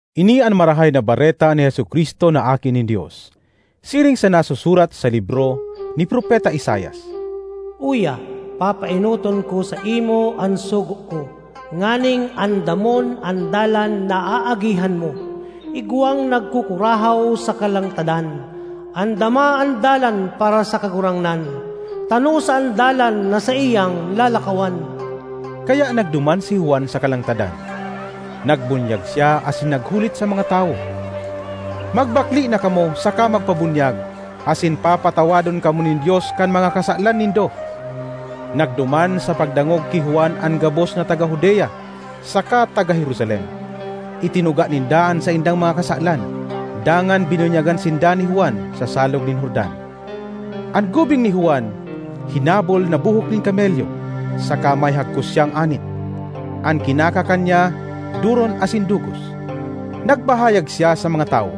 Ini an Marahay na Bareta ni Jesu-Cristo na Aki nin Dios, siring sa nasusurat sa libro ni Propeta Isaias: “‘Uya, papaenoton ko saimo an sugo ko, nganing andamon an dalan na aagihan mo.’ Igwang nagkukurahaw sa kalangtadan: ‘Andama an dalan para sa Kagurangnan; tanosa an dalan na saiyang lalakawan!’” Kaya nagduman si Juan sa kalangtadan. Nagbunyag siya asin naghulit sa mga tawo, “Magbakle na kamo saka magpabunyag asin papatawadon kamo nin Dios kan mga kasalan nindo.” Nagduman sa pagdangog ki Juan an gabos na taga Judea saka taga Jerusalem. Itinuga ninda an saindang mga kasalan dangan binunyagan sinda ni Juan sa Salog nin Jordan. An gubing ni Juan hinabol na buhok nin kamelyo saka may hagkos siyang anit; an kinakakan niya doron asin dugos. Nagpahayag siya sa mga tawo,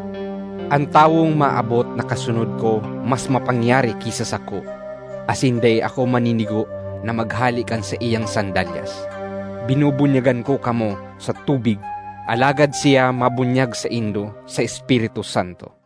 “An tawong maabot na kasunod ko mas mapangyari ki sa sako, asin dai ako maninigo na maghale kan saiyang sandalyas. Binubunyagan ko kamo sa tubig, alagad siya mabunyag saindo sa Espiritu Santo.”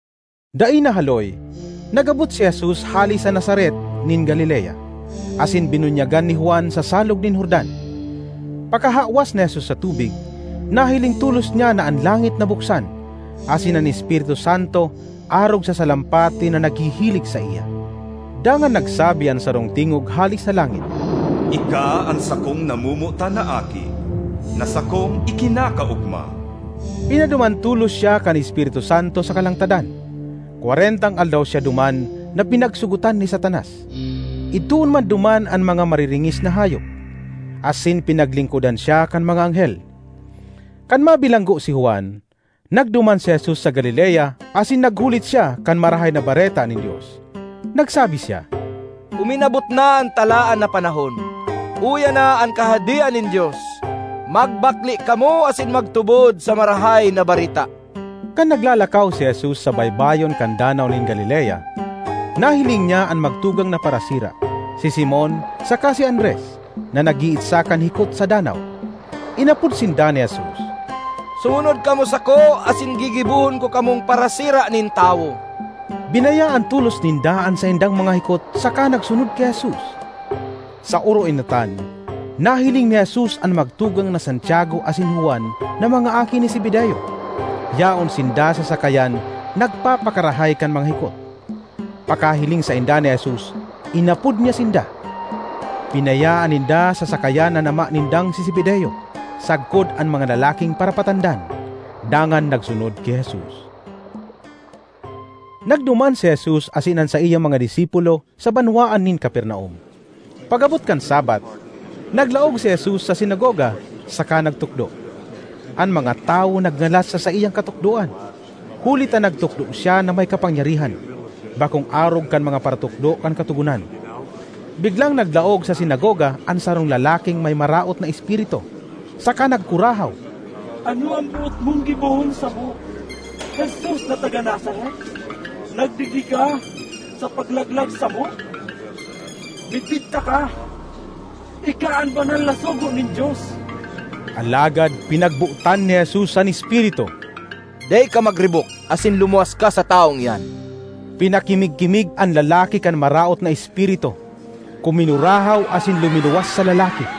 Dai nahaloy nag-abot si Jesus hale sa Nazaret nin Galilea asin binunyagan ni Juan sa Salog nin Jordan. Pakahawas ni Jesus sa tubig, nahiling tolos niya na an langit nabuksan asin an Espiritu Santo arog sa salampati na naghihilig saiya. Dangan nagsabi an sarong tingog hale sa langit, “Ika an sakong namomotan na Aki na sakong ikinakaogma.” Pinaduman tolos siya kan Espiritu Santo sa kalangtadan. Kwarentang aldaw siya duman, na pinagsogotan ni Satanas. Idtoon man duman an mga mariringis na hayop; asin pinaglingkodan siya kan mga anghel. Kan mabilanggo si Juan, nagduman si Jesus sa Galilea asin naghulit siya kan Marahay na Bareta nin Dios. Nagsabi siya, “Uminabot na an talaan na panahon; uya na an Kahadean nin Dios! Magbakle kamo asin magtubod sa Marahay na Bareta!” Kan naglalakaw si Jesus sa baybayon kan Danaw nin Galilea, nahiling niya an magtugang na parasira—si Simon saka si Andres—na nag-iitsa kan hikot sa danaw. Inapod sinda ni Jesus, “Sumunod kamo sako asin gigibohon ko kamong parasira nin tawo.” Binayaan tolos ninda an saindang mga hikot saka nagsunod ki Jesus. Sa oroenotan nahiling ni Jesus an magtugang na Santiago asin Juan na mga aki ni Zebedeo. Yaon sinda sa sakayan nagpapakarahay kan mga hikot. Pakahiling sainda ni Jesus inapod niya sinda; binayaan ninda sa sakayan an ama nindang si Zebedeo sagkod an mga lalaking parapatandan, dangan nagsunod ki Jesus. Nagduman si Jesus asin an saiyang mga disipulo sa banwaan nin Capernaum. Pag-abot kan Sabbath, naglaog si Jesus sa sinagoga saka nagtukdo. An mga tawo nagngalas sa saiyang katukdoan, huli ta nagtukdo siya na may kapangyarihan, bakong arog kan mga paratukdo kan katogonan. Biglang naglaog sa sinagoga an sarong lalaking may maraot na espiritu saka nagkurahaw, ”Ano an boot mong gibohon samo, Jesus na taga Nazaret? Nagdigdi ka sa paglaglag samo? Midbid taka: ika an banal na sugo nin Dios!” Alagad pinagbotan ni Jesus an espiritu, “Dai ka magribok asin lumuwas ka sa tawong iyan!” Pinakimig-kimig an lalaki kan maraot na espiritu, kuminurahaw asin luminuwas sa lalaki.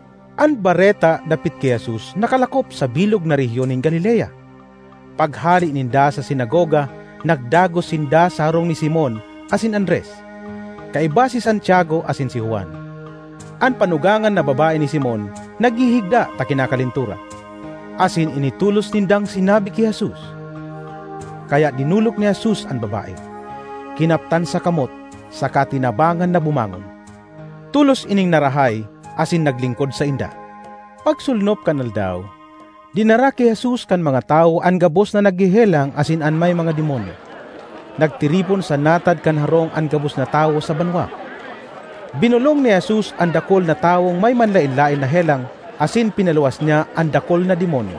An bareta dapit ki Jesus nakalakop sa bilog na rehiyon nin Galilea. Paghale ninda sa sinagoga nagdagos sinda sa harong ni Simon asin Andres, kaiba si Santiago asin si Juan. An panugangan na babae ni Simon naghihigda ta kinakalentura, asin ini tolos nindang sinabi ni (ki) Jesus. Kaya dinolok ni Jesus an babae, kinaptan sa kamot saka tinabangan na bumangon. Tolos ining narahay asin naglingkod sainda. Pagsolnop kan aldaw, dinara ki Jesus kan mga tawo an gabos na naghehelang asin an mga may demonyo. Nagtiripon sa natad kan harong an gabos na tawo sa banwa. Binolong ni Jesus an dakul na tawong may manlaen-laen na helang asin pinaluwas niya an dakul na demonyo.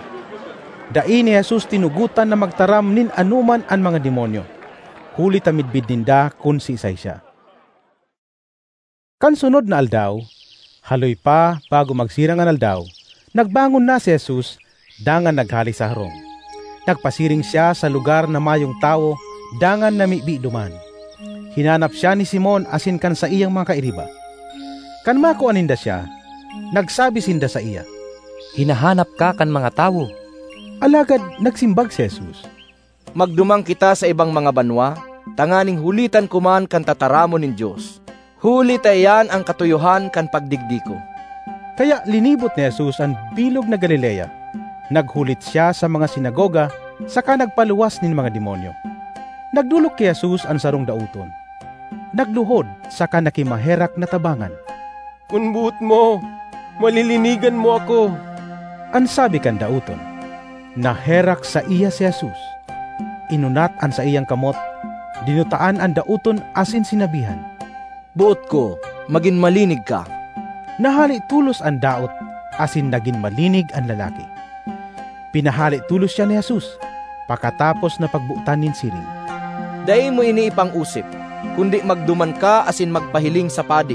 Dai ni Jesus tinugotan na magtaram nin anoman an mga demonyo huli ta midbid ninda kun siisay siya. Kan sunod na aldaw, haloy pa bago magsirang an aldaw, nagbangon na si Jesus dangan naghale sa harong. Nagpasiring siya sa lugar na mayong tawo dangan namibi duman. Hinanap siya ni Simon asin kan saiyang mga kairiba. Kan makua ninda siya, nagsabi sinda saiya, “Hinahanap ka kan mga tawo.” Alagad nagsimbag si Jesus, “Magduman kita sa ibang mga banwa tanganing hulitan ko man kan tataramon nin Dios, huli ta iyan an katuyohan kan pagdigdi ko.” Kaya linibot ni Jesus an bilog na Galilea. Naghulit siya sa mga sinagoga saka nagpaluwas nin mga demonyo. Nagdolok ki Jesus an sarong daoton, naghulod (nagluhod) saka nakimaherak na tabangan. “Kun boot mo, malilinigan mo ako,” an sabi kan daoton. Naherak saiya si Jesus, inunat an saiyang kamot, dinutaan an daoton asin sinabihan, “Boot ko! Magin malinig ka!” Nahale tolos an daot asin nagin malinig an lalaki. Pinahale tolos siya ni Jesus pakatapos na pagbotan nin siring: ”Dai mo ini ipang-osip, kundi magduman ka asin magpahiling sa padi;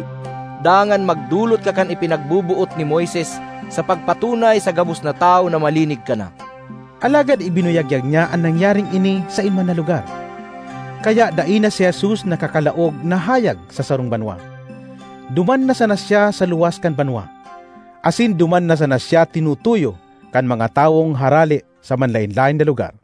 dangan magdolot ka kan ipinagboboot ni Moises sa pagpatunay sa gabos na tawo na malinig ka na.” Alagad ibinuyagyag niya an nangyaring ini saen man na lugar. Kaya dai na si Jesus nakakalaog na hayag sa sarong banwa. Duman na sana siya sa luwas kan banwa; asin duman na sana siya tinutuyo kan mga tawong harale sa manlaen-laen na lugar.